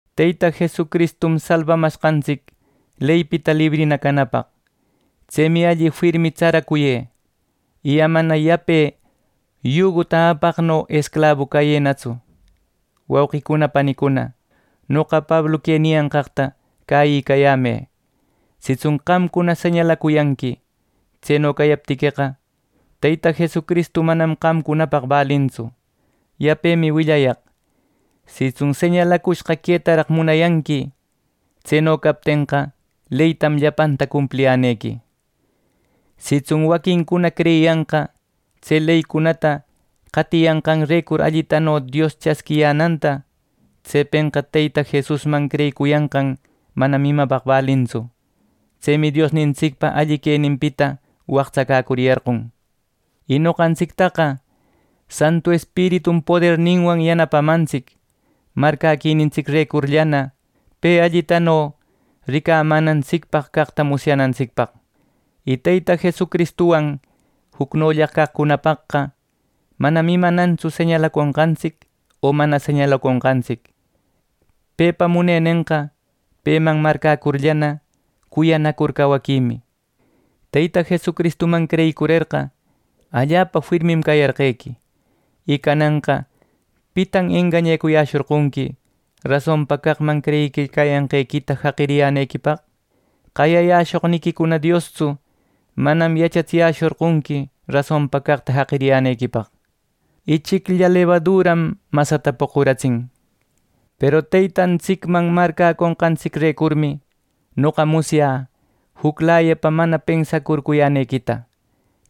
Teyta Jesucristum salbamashqantsic leypita librina canapaq. Tsemi alli firmi tsaracuyë, y amana yape yuguta apaqno esclabu cayënatsu. Wauqicuna, panicuna, noqa Pablu que niyanqaqta cäyicayämë. Sitsun qamcuna señalacuyanqui; tseno cayaptiqueqa, Teyta Jesucristu manam qamcunapaq balintsu. Yapemi willayaq: Sitsun señalacushqa quetaraq munayanqui, tseno captenqa leytam llapanta cumpliyänequi. Sitsun waquincuna creyiyanqa tse leycunata qatiyanqanrecur allitano Dios chasquiyänanta; tsepenqa Teyta Jesusman creyicuyanqan manam imapaq balintsu. Tsemi Diosnintsicpa alli queninpita waqtsacäcuriyarqon. Y noqantsictaqa Santu Espiritum poderninwan yanapamantsic marcäquinintsicrecurllana pe allitano ricamänantsicpaq caqta musyanantsicpaq. Y Teyta Jesucristuwan jucnolla caqcunapaqqa manam imanantsu señalaconqantsic o mana señalaconqantsic. Pepa munenenqa peman marcäcurllana, cuyanacur cawaquimi. Teyta Jesucristuman creyicurerqa, allapa firmim cayarqequi. Y cananqa ¿pitan engañayäshorqonqui rasonpa caqman creyiquicayanqequita jaqiriyänequipaq? Qayayäshoqnïqui Diostsu manam yachatsiyäshorqonqui rasonpa caqta jaqiriyänequipaq. Ichiclla lebaduram masata poquratsin. Peru Teytantsicman marcäconqantsicrecurmi noqa musyä juclayapa mana pensacurcuyänequita.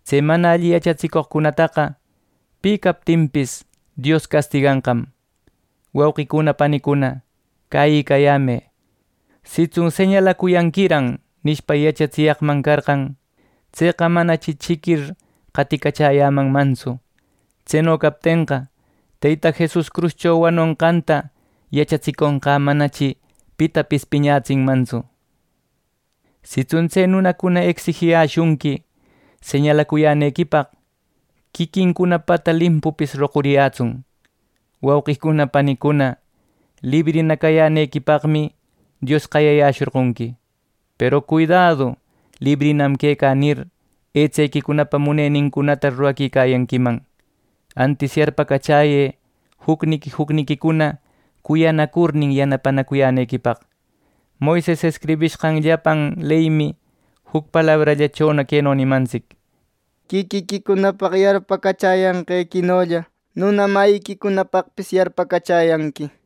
Tse mana alli yachatsicoqcunataqa, pi captinpis, Dios castiganqam. Wauqicuna, panicuna, cäyiyämë. Sitsun “Señalacuyanquiran” nishpa, yachatsiyaqman carqan, tseqa manachi chiquir qaticachäyämanmantsu. Tseno captenqa, Teyta Jesus cruscho wanonqanta yachatsiconqä manachi pitapis piñatsinmantsu. Sitsun tse nunacuna ecsijiyäshunqui señalacuyänequipaq, quiquincunapata limpupis roquriyätsun. Wauqicuna, panicuna, librina cayänequipaqmi, Dios qayayäshorqonqui. Peru cuidädu “Librinam quecä” nir, etsequicunapa munenincunata ruraquicayanquiman. Antis yarpacachäyë jucniqui jucniquicuna cuyanacurnin yanapanacuyänequipaq. Moises escribishqan llapan leymi juc palabrallachona queno nimantsic: “Quiquiquipaq yarpacachanqequinolla, nuna mayïquicunapaqpis yarpacachäyanqui” nir.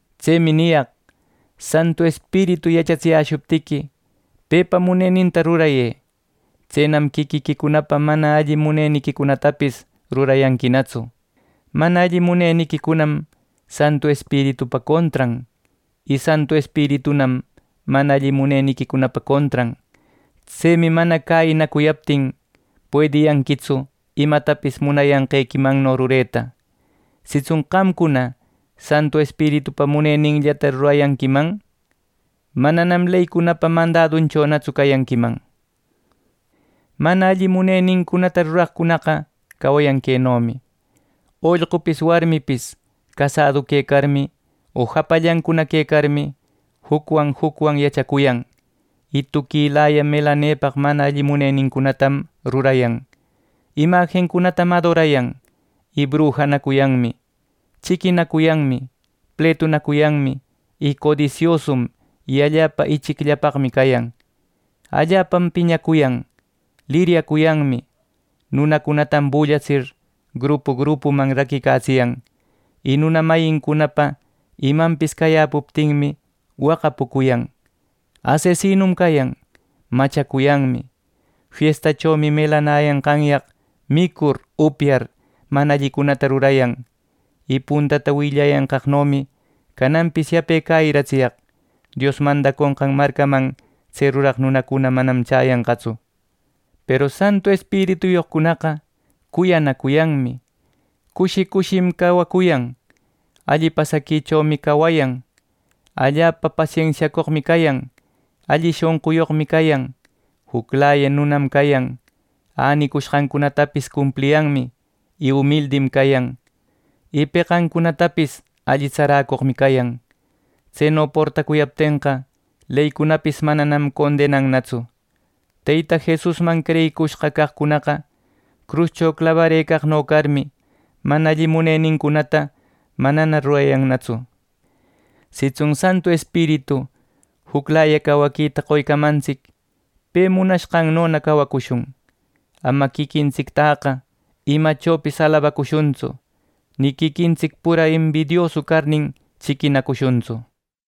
Tsemi niyaq: Santu Espiritu yachatsiyäshuptiqui, pepa muneninta rurayë. Tsenam quiquiquicunapa mana alli muneniquicunatapis rurayanquinatsu. Mana alli muneniquicunam Santu Espiritupa contran. Y Santu Espiritunam mana alli muneniquicunapa contran. Tsemi mana cäyinacuyaptin, puediyanquitsu imatapis munayanqequimanno rureta. Sitsun qamcuna Santu Espiritupa muneninllata rurayanquiman, mananam leycunapa mandadunchonatsu cayanquiman. Mana alli munenincunata ruraqcunaqa cawayan quenomi: Ollqupis warmipis casadu quecarmi o japallancuna quecarmi, jucwan jucwan yachacuyan; y tuquilaya melanepaq mana alli munenincunatam rurayan. Imajincunatam adorayan, y brujanacuyanmi, chiquinacuyanmi, pletunacuyanmi, y codisiosum, y allapa ichicllapaqmi cayan, allapam piñacuyan, liriyacuyanmi, nunacunatam bullatsir grupu grupuman raquicatsiyan. Y nuna mayincunapa imanpis cayäpuptinmi waqapucuyan, ˻asesinum cayan,˼ machacuyanmi. Fiestachomi melanayanqanyaq micur, upyar mana allicunata rurayan. Y puntata willayanqaqnomi cananpis yape cäyiratsiyaq: Dios mandaconqan marcaman tse ruraq nunacuna manam chäyanqatsu. Peru Santu Espirituyoqcunaqa cuyanacuyanmi. Cushi cushim cawacuyan. Alli pasaquichomi cawayan. Allapa pasensiacoqmi cayan. Alli shonquyoqmi cayan. Juclaya nunam cayan, änicushqantapis cumpliyanmi, y umildim cayan, y peqancunatapis alli tsaräcoqmi cayan. Tseno portacuyaptenqa, leycunapis manam condenannatsu. Teyta Jesusman creyicushqa caqcunaqa cruscho clabarëcaqno carmi, mana alli munenincunata manana rurayannatsu. Sitsun Santu Espiritu juclaya cawaquita qoycamantsic pe munanqannona cawacushun. Ama quiquintsictäqa imachopis alabacushuntsu, ni quiquintsic pura embidiosu carnin chiquinacushuntsu.